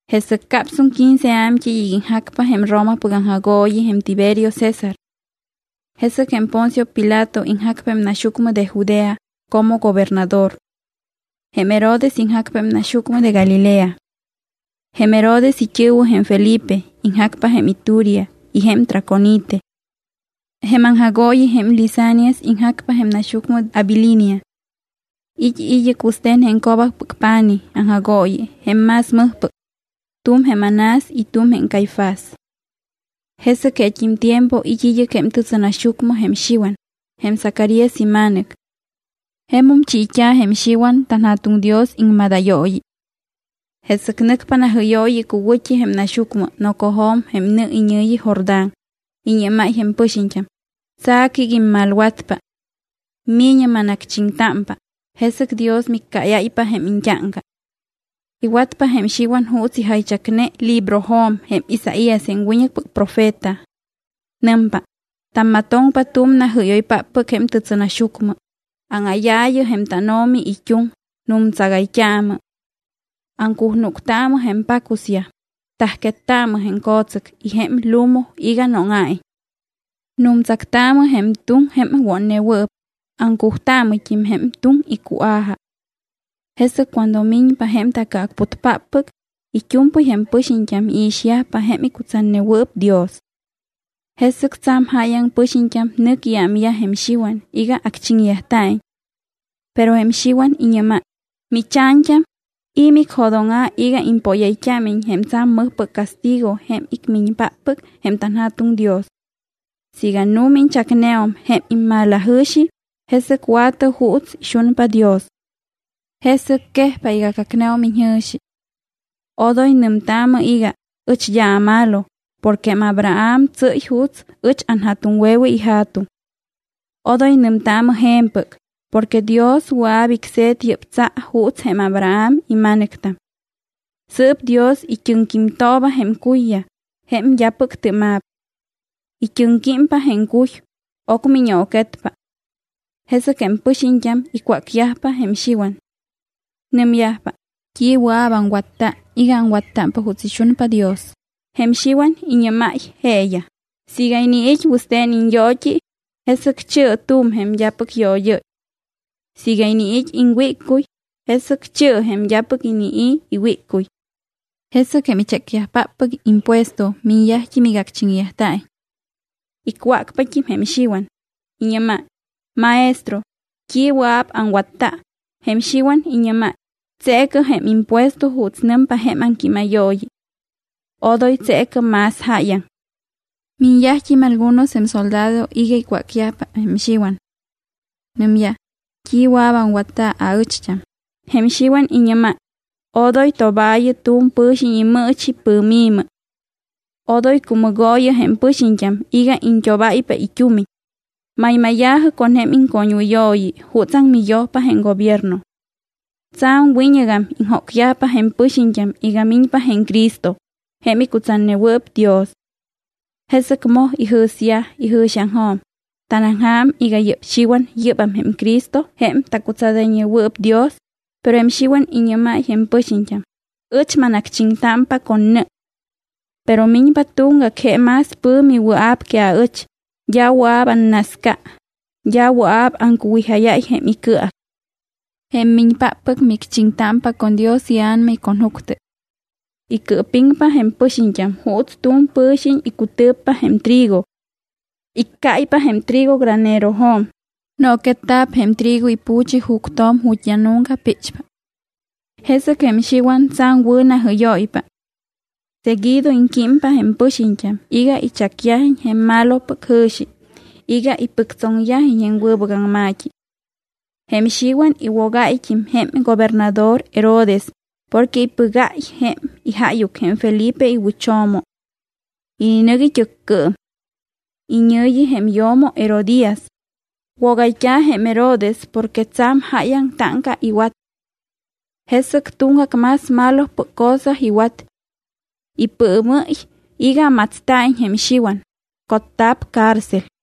Jesɨc capsum quince a̱mt́ɨy iga iŋjacpa jém Romapɨc aŋjagooyi jém Tiberio César. Jesɨc jém Poncio Pilato iŋjacpa jém naxyucmɨ de Judea como gobernador. Jém Herodes iŋjacpa jém naxyucmɨ de Galilea. Jém Herodes it́ɨ̱wɨ jém Felipe iŋjacpa jém Iturea y jém Traconite. Jém aŋjagooyi jém Lisanias iŋjacpa jém naxyucmɨ Abilinia. It́ id́ɨc wɨste̱n jém co̱bacpɨc pa̱nij aŋjagooyi jém más mɨjpɨc. Tu̱m jém Anás y tu̱m jém Caifás. Jesɨc jeet́im tiempo it́ id́ɨc jém tɨtsɨnaxyucmɨ jém Xiwan, jém Zacarías ima̱nɨc. Jemum chiit́a̱ jém Xiwan tanJa̱tuŋ Dios iŋmadayooyi. Jesɨc nɨcpa najɨ́yooyi icuwɨ̱t́i jém naxyucmɨ nocojo̱m jém nɨ iñɨ̱yi Jordán. Iñɨ́máy jém pɨxiñt́am: —Tsa̱cɨ iga immalwatpa. Mi̱ñɨ manacchiŋtámpa, jesɨc Dios miccáyáypa jém iñt́áŋca. Iwatpa jém Xiwan juuts ijaychacne librojo̱m jém Isaías jém wiñɨcpɨc profeta. Nɨmpa: Tammatoŋpa tu̱m najɨ́yoypáppɨc jém tɨtsɨnaxyucmɨ: “Áŋáyaayɨ jém tánO̱mi it́uŋ, nu̱mtsagayt́aamɨ.” Aŋcujnúctaamɨ jém pacusyaj, tajquettaamɨ jém co̱tsɨc y jém lumu iga nóŋa̱iñ. Nu̱mtsactaamɨ jém tuŋ jém wotnewɨɨp, aŋcujtaamɨt́im jém tuŋ icua̱ja. Jesɨc cuando miñpa jém taCɨacputpáppɨc, it́u̱mpɨy jém pɨxiñt́am iixyajpa jém icutsatnewɨɨp Dios. Jesɨc tsa̱m jáyaŋ pɨxiñt́am nɨc iámyaj jém Xiwan iga acchiŋyajta̱iñ. Pero jém Xiwan iñɨ́máy: —¿Micha̱ñt́am, i̱ micjo̱dóŋa̱ iga impóyayt́ámiñ jém tsa̱m mɨjpɨc castigo jém icmiñpáppɨc jém tanJa̱tuŋ Dios? Siiga nu̱ma iñchacneum jém immalajɨ̱xi, jesɨc wa̱tɨ juuts ixunpa Dios. Jesɨc quejpa iga cacneum iñjɨ̱xi. Odoy nɨmtaamɨ iga: “Ɨch d́a amalo porque jém Abraham tsɨ́y juuts ɨch anja̱tuŋwe̱we ija̱tuŋ.” Odoy nɨmtaamɨ je̱mpɨc porque Dios wɨa̱p icse̱t yɨ́p tsa juuts jém Abraham ima̱nɨctam. Sɨɨp Dios it́ɨŋquímtooba jém cuyyaj jém d́apɨc tɨ́ma̱p. It́ɨŋquímpa jém cuy, ocmɨ iñooquetpa. Jesɨc jém pɨxiñt́am icwácyajpa jém Xiwan. Nɨmyajpa: —¿T́i wɨa̱p aŋwatta iga aŋwattámpa juuts ixunpa Dios? Jém Xiwan iñɨ́máy jeeyaj: —Siiga iniit́ wɨste̱n iñyoot́i, jesɨc chi̱ɨ tu̱m jém d́apɨc yood́ɨ́y. Siiga iniit́ iŋwíccuy, jesɨc chi̱ɨ jém d́apɨc inii̱ iwíccuy. Jesɨc jém ichécyajpáppɨc impuesto miñyajt́im iga acchiŋyajta̱iñ. Icwácpat́im jém Xiwan, iñɨ́máy: —Maestro, ¿t́i wɨa̱p aŋwatta? Jém Xiwan iñɨ́máy: —Tseecɨ jém impuesto juuts nɨmpa jém aŋquímayooyi. Odoy tseecɨ más jáyaŋ. Miñyajt́im algunos jém soldado iga icwácyajpa jém Xiwan. Nɨmyaj: —¿T́i wɨa̱p aŋwatta aɨcht́am? Jém Xiwan iñɨ́máy: —Odoy tobaayɨ tu̱m pɨ̱xiñ imɨɨchi pɨ̱mi̱mɨ. Odoy cumɨgooyɨ jém pɨxiñt́am iga iñt́obáypa it́umiñ. Maymáya̱jɨ con jém iŋcoñwɨyooyi jutsaŋ miyojpa jém gobierno. Tsa̱m wiñɨgam iŋjócyajpa jém pɨxiñt́am iga miñpa jém Cristo jém icutsatnewɨɨp Dios. Jesɨc moj ijɨ̱syaj ijɨ̱xiaŋjo̱m, ¿tanaŋja̱m iga yɨ́p Xiwan yɨ́bam jém Cristo jém tacutsadayñewɨɨp Dios? Pero jém Xiwan iñɨ́máy jém pɨxiñt́am: —Ɨch manacchiŋtámpa con nɨ. Pero miñpa tuŋgac, je más pɨ̱mi wɨa̱p que aɨch, d́a wɨa̱p annasca. D́a wɨa̱p aŋcuwijáyáy jém icɨac. Jém miñpáppɨc micchiŋtámpa con Dios iA̱nama y con juctɨ. Icɨɨpiŋpa jém pɨxiñt́am juuts tu̱m pɨ̱xiñ icutɨ̱ppa jém trigo. Iccáypa jém trigo granerojo̱m. Nooquetta̱p jém trigo ipu̱chi juctjo̱m ju̱t́ d́a nunca píchpa. Jesɨc jém Xiwan tsa̱m wɨ̱ najɨ́yóypa. Seguido iŋquímpa jém pɨxiñt́am iga ichacyajiñ jém malopɨc jɨ̱xi iga ipɨctsoŋyajiñ jém wɨbɨc aŋma̱t́i. Jém Xiwan iwogáyt́im jém gobernador Herodes porque ipɨgáy jém ijáyuc jém Felipe iwɨcho̱mo. Ininɨc it́ɨccɨɨm. Iñɨ̱yi jém yo̱mo Herodías. Wogayt́a̱ jém Herodes porque tsa̱m jáyaŋ táŋca iwat. Jesɨc tuŋgac más malopɨc cosa iwat. Ipɨɨmɨ́y iga matsta̱iñ jém Xiwan, cotta̱p cárcel.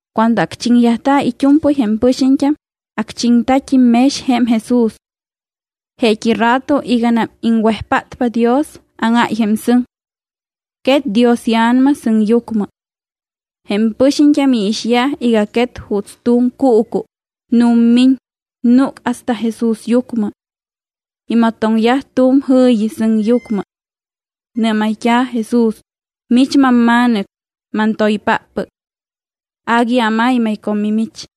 Cuando acchiŋyajta̱ it́u̱mpɨy jém pɨxiñt́am, acchiŋta̱t́im mex jém Jesús. Jeet́i rato iganam iŋwejpátpa Dios, áŋáy jém sɨŋ. Quet Dios iA̱nama sɨŋyucmɨ. Jém pɨxiñt́am iixyaj iga quet juuts tu̱m cuucu, nu̱mmiñ, núc hasta jém Jesúsyucmɨ. Imatoŋyaj tu̱m jɨ̱yi sɨŋyucmɨ. Nɨ́mayt́a̱ Jesús: —Mich mamMa̱nɨc, mantoypáppɨc. Agui amaymay con mimich.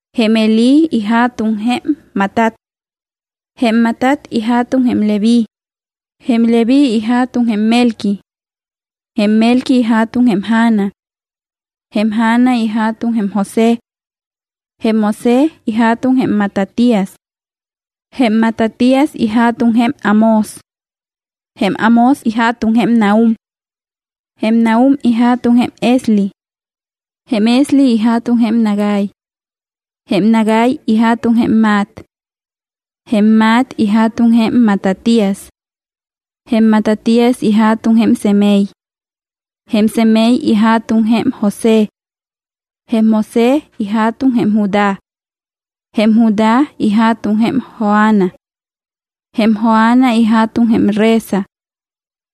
Jém Helí ija̱tuŋ jém Matat. Jém Matat ija̱tuŋ jém Leví. Jém Leví ija̱tuŋ jém Melqui. Jém Melqui ija̱tuŋ jém Jana. Jém Jana ija̱tuŋ jém José. Jém José ija̱tuŋ jém Matatías. Jém Matatías ija̱tuŋ jém Amós. Jém Amós ija̱tuŋ jém Nahum. Jém Nahum ija̱tuŋ jém Esli. Jém Esli ija̱tuŋ jém Nagai. Jém Nagai ija̱tuŋ jém Maat. Jém Maat ija̱tuŋ jém Matatías. Jém Matatías ija̱tuŋ jém Semei. Jém Semei ija̱tuŋ jém José. Jém José ija̱tuŋ jém Judá. Jém Judá ija̱tuŋ jém Joana. Jém Joana ija̱tuŋ jém Resa.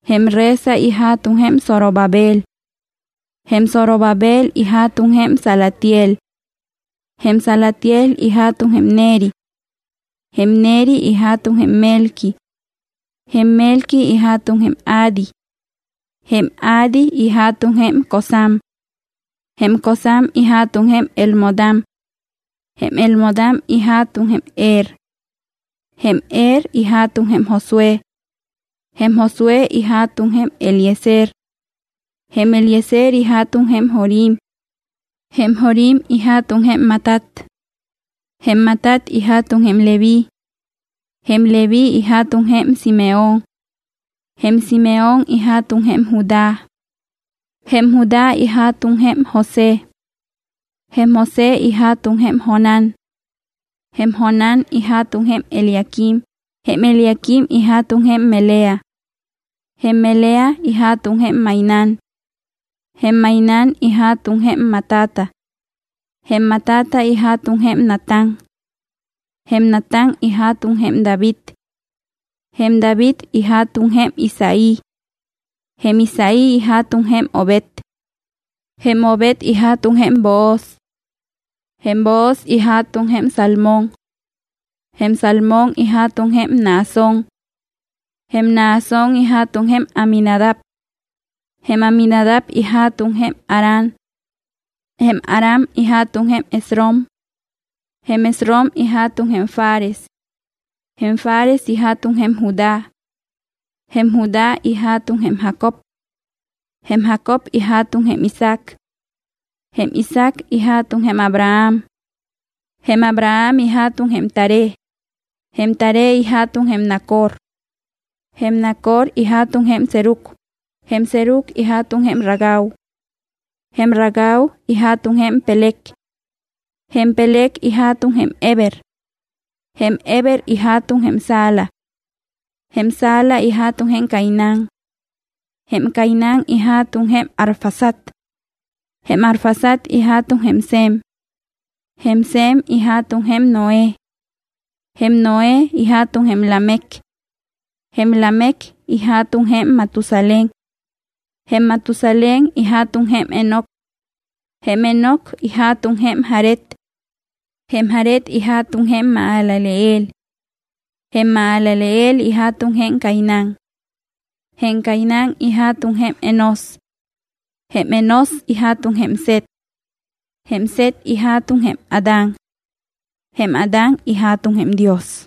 Jém Resa ija̱tuŋ jém Zorobabel. Jém Zorobabel ija̱tuŋ jém Salatiel. Jém Salatiel ija̱tuŋ jém Neri. Jém Neri ija̱tuŋ jém Melqui. Jém Melqui ija̱tuŋ jém Adi. Jém Adi ija̱tuŋ jém Cosam. Jém Cosam ija̱tuŋ jém Elmodam. Jém Elmodam ija̱tuŋ jém Er. Jém Er ija̱tuŋ jém Josué. Jém Josué ija̱tuŋ jém Eliezer. Jém Eliezer ija̱tuŋ jém Jorim. Jém Jorim ija̱tuŋ jém Matat. Jém Matat ija̱tuŋ jém Leví. Jém Leví ija̱tuŋ jém Simeón. Jém Simeón ija̱tuŋ jém Judá. Jém Judá ija̱tuŋ jém José. Jém José ija̱tuŋ jém Jonán. Jém Jonán ija̱tuŋ jém Eliaquim. Jém Eliaquim ija̱tuŋ jém Melea. Jém Melea ija̱tuŋ jém Mainán. Jém Mainán ija̱tuŋ jém Matata. Jém Matata ija̱tuŋ jém Natán. Jém Natán ija̱tuŋ jém David. Jém David ija̱tuŋ jém Isaí. Jém Isaí ija̱tuŋ jém Obed. Jém Obed ija̱tuŋ jém Booz. Jém Booz ija̱tuŋ jém Salmón. Jém Salmón ija̱tuŋ jém Naasón. Jém Naasón ija̱tuŋ jém Aminadab. Jém Aminadab ija̱tuŋ jém Aram. Jém Aram ija̱tuŋ jém Esrom. Jém Esrom ija̱tuŋ jém Fares. Jém Fares ija̱tuŋ jém Judá. Jém Judá ija̱tuŋ jém Jacob. Jém Jacob ija̱tuŋ jém Isaac. Jém Isaac ija̱tuŋ jém Abraham. Jém Abraham ija̱tuŋ jém Taré. Jém Taré ija̱tuŋ jém Nacor. Jém Nacor ija̱tuŋ jém Serug. Jém Serug ija̱tuŋ jém Ragau. Jém Ragau ija̱tuŋ jém Peleg. Jém Peleg ija̱tuŋ jém Heber. Jém Heber ija̱tuŋ jém Sala. Jém Sala ija̱tuŋ jém Cainán. Jém Cainán ija̱tuŋ jém Arfaxad. Jém Arfaxad ija̱tuŋ jém Sem. Jém Sem ija̱tuŋ jém Noé. Jém Noé ija̱tuŋ jém Lamec. Jém Lamec ija̱tuŋ jém Matusalén. Jém Matusalén ija̱tuŋ jém Enoc. Jém Enoc ija̱tuŋ jém Jared. Jém Jared ija̱tuŋ jém Mahalaleel. Jém Mahalaleel ija̱tuŋ jém Cainán. Jém Cainán ija̱tuŋ jém Enós. Jém Enós ija̱tuŋ jém Set. Jém Set ija̱tuŋ jém Adán. Jém Adán ija̱tuŋ jém Dios.